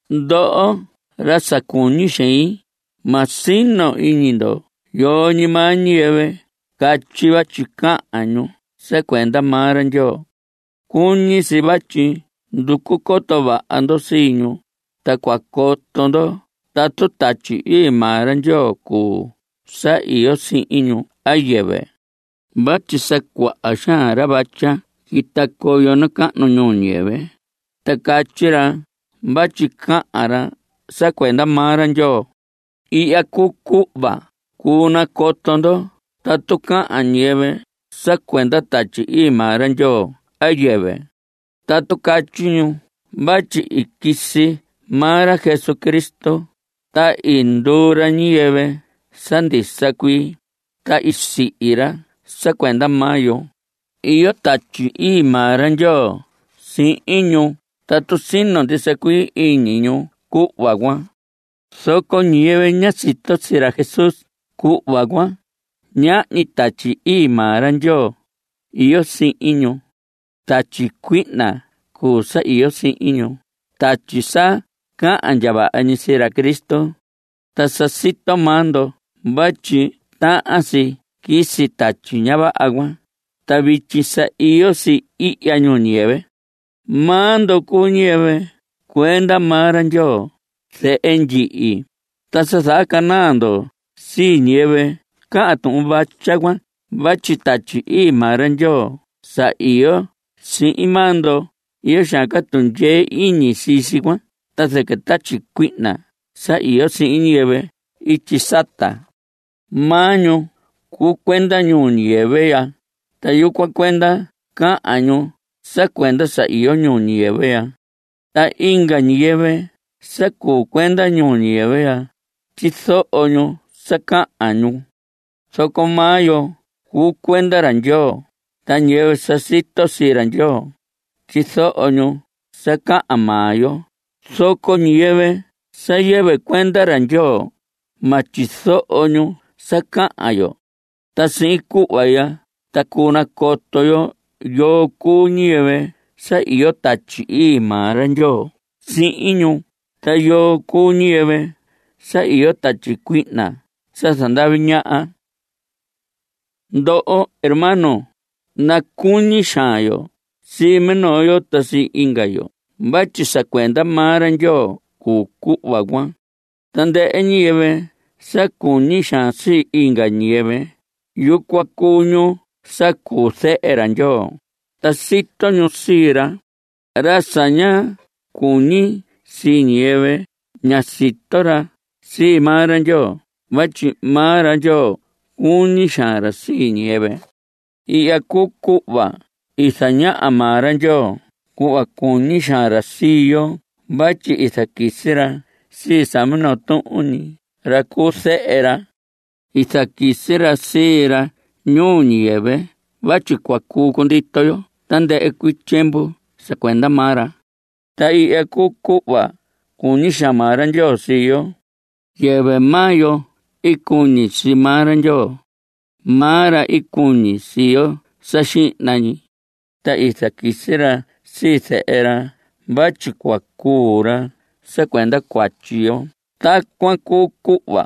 Ndoho ra sa cuñi xein, ma sino iñi ndo yoo ñi maa ñiyɨvɨ catyi vatyi cahan ñu sa cuenda maa ra Ndyoo. Cuñi si vatyi nducu coto vaha ndo sii ñu, ta cua coto ndo tatu Tatyi Ii maa ra Ndyoo cuu sa iyo sihin ñu a yɨvɨ. Vatyi sa cuaha xaan ra vatya quita coyo nacahnu ñuu ñiyɨvɨ, ta catyi ra vatyi cahan ra sa cuenda maa ra Ndyoo. Ihya cuu cuhva cuu nacoto ndo tatu cahan ñiyɨvɨ sa cuenda Tatyi Ii maa ra Ndyoo a yɨvɨ. Tatu catyi ñu vatyi i quisi maa ra Jesucristo, ta i nduu ra ñiyɨvɨ sa ndisa cuii, ta sihi ra sa cuenda maa yo, iyo Tatyi Ii maa ra Ndyoo sihin ñu tatu sino ndisa cuii iñi ñu cuhva cuan. Zoco ñiyɨvɨ ña sito sii ra Jesús cuhva cuan, ñahñi Tatyi Ii maa ra Ndyoo iyo sihin ñu. Tatyi cuihna cuu sa iyo sihin ñu, tatyi sa cahan ndya vaha ñi sii ra Cristo. Ta sa sito maa ndo vatyi tahan si quisi tatyi ña vaha cuan, ta vityi sa iyo si ihya ñuu ñiyɨvɨ. Maa ndo cuu ñiyɨvɨ cuenda maa ra Ndyoo, zehe ndyihi, ta sa zahacanaa ndo sii ñiyɨvɨ cahan tuhun vatya cuan vatyi Tatyi Ii maa ra Ndyoo sa iyo sihin maa ndo, iyo xaan ca tundyee iñi sii si cuan ta zɨquɨ tatyi cuihna sa iyo sihin ñiyɨvɨ ityi sata. Maa ñu cuu cuenda ñuu ñiyɨvɨ ya. Ta yucuan cuenda cahan ñu sa cuenda sa iyo ñuu ñiyɨvɨ ya. Ta inga ñiyɨvɨ sa cuu cuenda ñuu ñiyɨvɨ ya, tyizoho ñu sa cahan ñu. Zoco maa yo cuu cuenda ra Ndyoo. Ta ñiyɨvɨ sa sito sii ra Ndyoo, tyizoho ñu sa cahan maa yo, zoco ñiyɨvɨ sa yɨvɨ cuenda ra Ndyoo, ma tyizoho ñu sa cahan yo. Ta sihin cuhva ya ta cuu nacoto yo yoo cuu ñiyɨvɨ sa iyo Tatyi Ii maa ra Ndyoo sihin ñu ta yoo cuu ñiyɨvɨ sa iyo tatyi cuihna sa zandavi ñaha. Ndoho hermanos, nacuñi xaan yo sii minoo yo ta sii inga yo vatyi sa cuenda maa ra Ndyoo cuu cuhva cuan. Tandɨhɨ ñiyɨvɨ sa cuñi xaan sii inga ñiyɨvɨ, yucuan cuu ñu sa cuu zehe ra Ndyoo, ta sito ñu sii ra. Ra sa ña cuñi sii ñiyɨvɨ, ña sito ra sii maa ra Ndyoo vatyi maa ra Ndyoo cuñi xaan ra sii ñiyɨvɨ. Ihya cuu cuhva i zañaha maa ra Ndyoo cuhva cuñi xaan ra sii yo vatyi i zaquisi ra sii sa minoo tuhun ñi ra cuu zehe ra. I zaquisi ra sii ra ñuu ñiyɨvɨ vatyi cua cuu cundito yo tandɨhɨ cuii tyiemvu sa cuenda maa ra. Ta ihya cuu cuhva i cuñi xaan maa ra Ndyoo sii yo. Yɨvɨ maa yo i cuñi sii maa ra Ndyoo. Maa ra i cuñi sii yo sa xihna ñi. Ta i zaquisi ra sii zehe ra vatyi cua cuu ra sa cuenda cuatyi yo. Tacuan cuu cuhva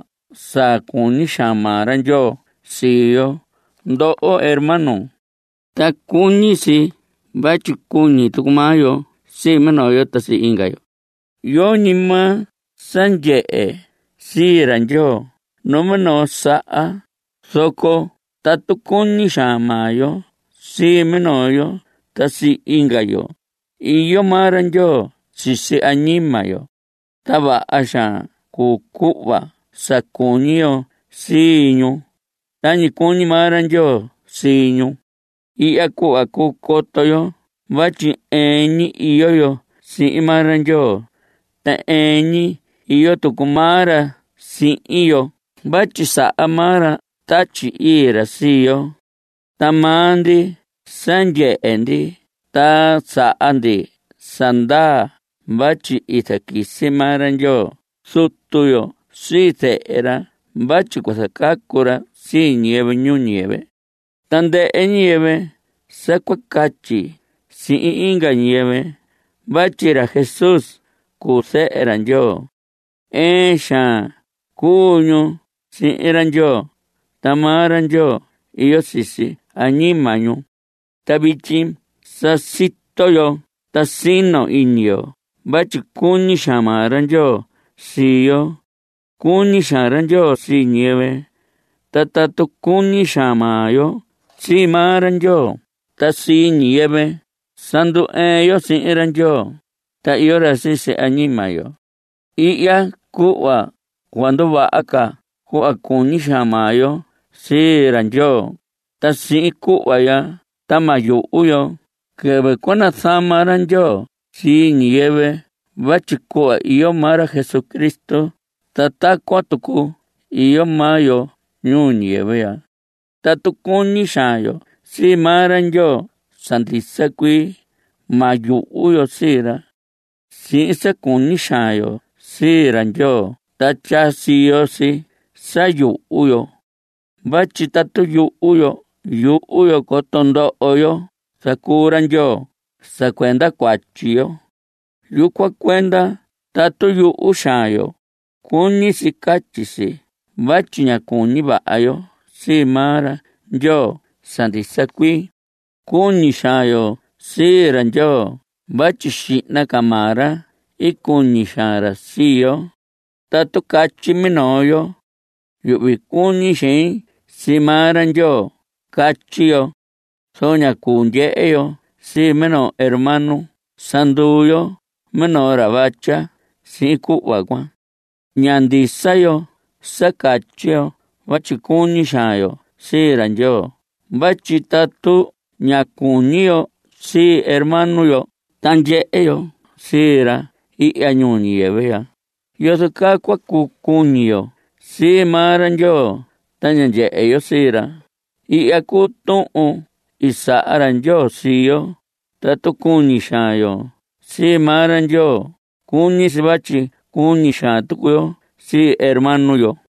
sa cuñi xaan maa ra Ndyoo sii yo, ndoho hermanos. Ta cuñi si vatyi cuñi tucu maa yo sii minoo yo ta sii inga yo. Yoñi maa sa ndyehe sii ra Ndyoo numinoo saha, zoco tatu cuñi xaan maa yo sii minoo yo ta sii inga yo, iyo maa ra Ndyoo sisi añima yo. Ta vaha xaan cuu cuhva sa cuñi yo sii ñu, tañi cuñi maa ra Ndyoo sii ñu. Ihya cuhva cuu coto yo vatyi ɨɨn ñi iyo yo sihin maa ra Ndyoo, ta ɨɨn ñi iyo tucu maa ra sihin yo vatyi saha maa ra Tatyi Ii ra sii yo. Ta maa ndi sa ndyehe ndi ta saha ndi sa ndaa vatyi i zaquisi maa ra Ndyoo Zutu yo sii zehe ra vatyi cua zacacu ra sii ñiyɨvɨ ñuu ñiyɨvɨ. Tandɨhɨ ñiyɨvɨ sa cua catyi sihin inga ñiyɨvɨ vatyi ra Jesús cuu zehe ra Ndyoo, ɨɨn xaan cuu ñu sihin ra Ndyoo, ta maa ra Ndyoo iyo sisi añima ñu. Ta vityi sa sito yo ta sino iñi yo vatyi cuñi xaan maa ra Ndyoo sii yo. Cuñi xaan ra Ndyoo sii ñiyɨvɨ, ta tatu cuñi xaan maa yo sii maa ra Ndyoo ta sii ñiyɨvɨ, sa ndu‑ɨɨn yo sihin ra Ndyoo. Ta iyo ra sisi añima yo. Ihya cuhva cuahan nduvaha ca cuhva cuñi xaan maa yo sii ra Ndyoo, ta sihin cuhva ya ta ma yuhu yo quɨvɨ cua zanahma ra Ndyoo sii ñiyɨvɨ vatyi cuhva iyo maa ra Jesucristo ta tacuan tucu iyo maa yo ñuu ñiyɨvɨ ya. Tatu cuñi xaan yo sii maa ra Ndyoo sa ndisa cuii, ma yuhu yo sii ra. Sihin sa cuñi xaan yo sii ra Ndyoo ta tyaa siyo si sa yuhu yo. Vatyi tatu yuhu yo, yuhu yo coto ndoho yo zacuu ra Ndyoo sa cuenda cuatyi yo. Yucuan cuenda tatu yuhu xaan yo, cuñi si catyi si vatyi ña cuñi vaha yo sii maa ra Ndyoo sa ndisa cuii. Cuñi xaan yo sii ra Ndyoo vatyi xihna ca maa ra i cuñi xaan ra sii yo. Tatu catyi minoo yo: “Yuhvi cuñi xein sii maa ra Ndyoo”, catyi yo. Zoco ña cuu ndyehe yo sii minoo hermano. Sa nduu yo minoo ra vatya sihin cuhva cuan. Ña ndisa yo sa catyi yo vatyi cuñi xaan yo sii ra Ndyoo vatyi tatu ña cuñi yo sii hermano yo ta ndyehe yo sii ra ihya ñuu ñiyɨvɨ ya ¿yozo caa cua cuu cuñi yo sii maa ra Ndyoo ta ña ndyehe yo sii ra? Ihya cuu tuhun sa i saha ra Ndyoo sii yo: Tatu cuñi xaan yo sii maa ra Ndyoo, cuñi si vatyi cuñi xaan tucu yo sii hermano yo.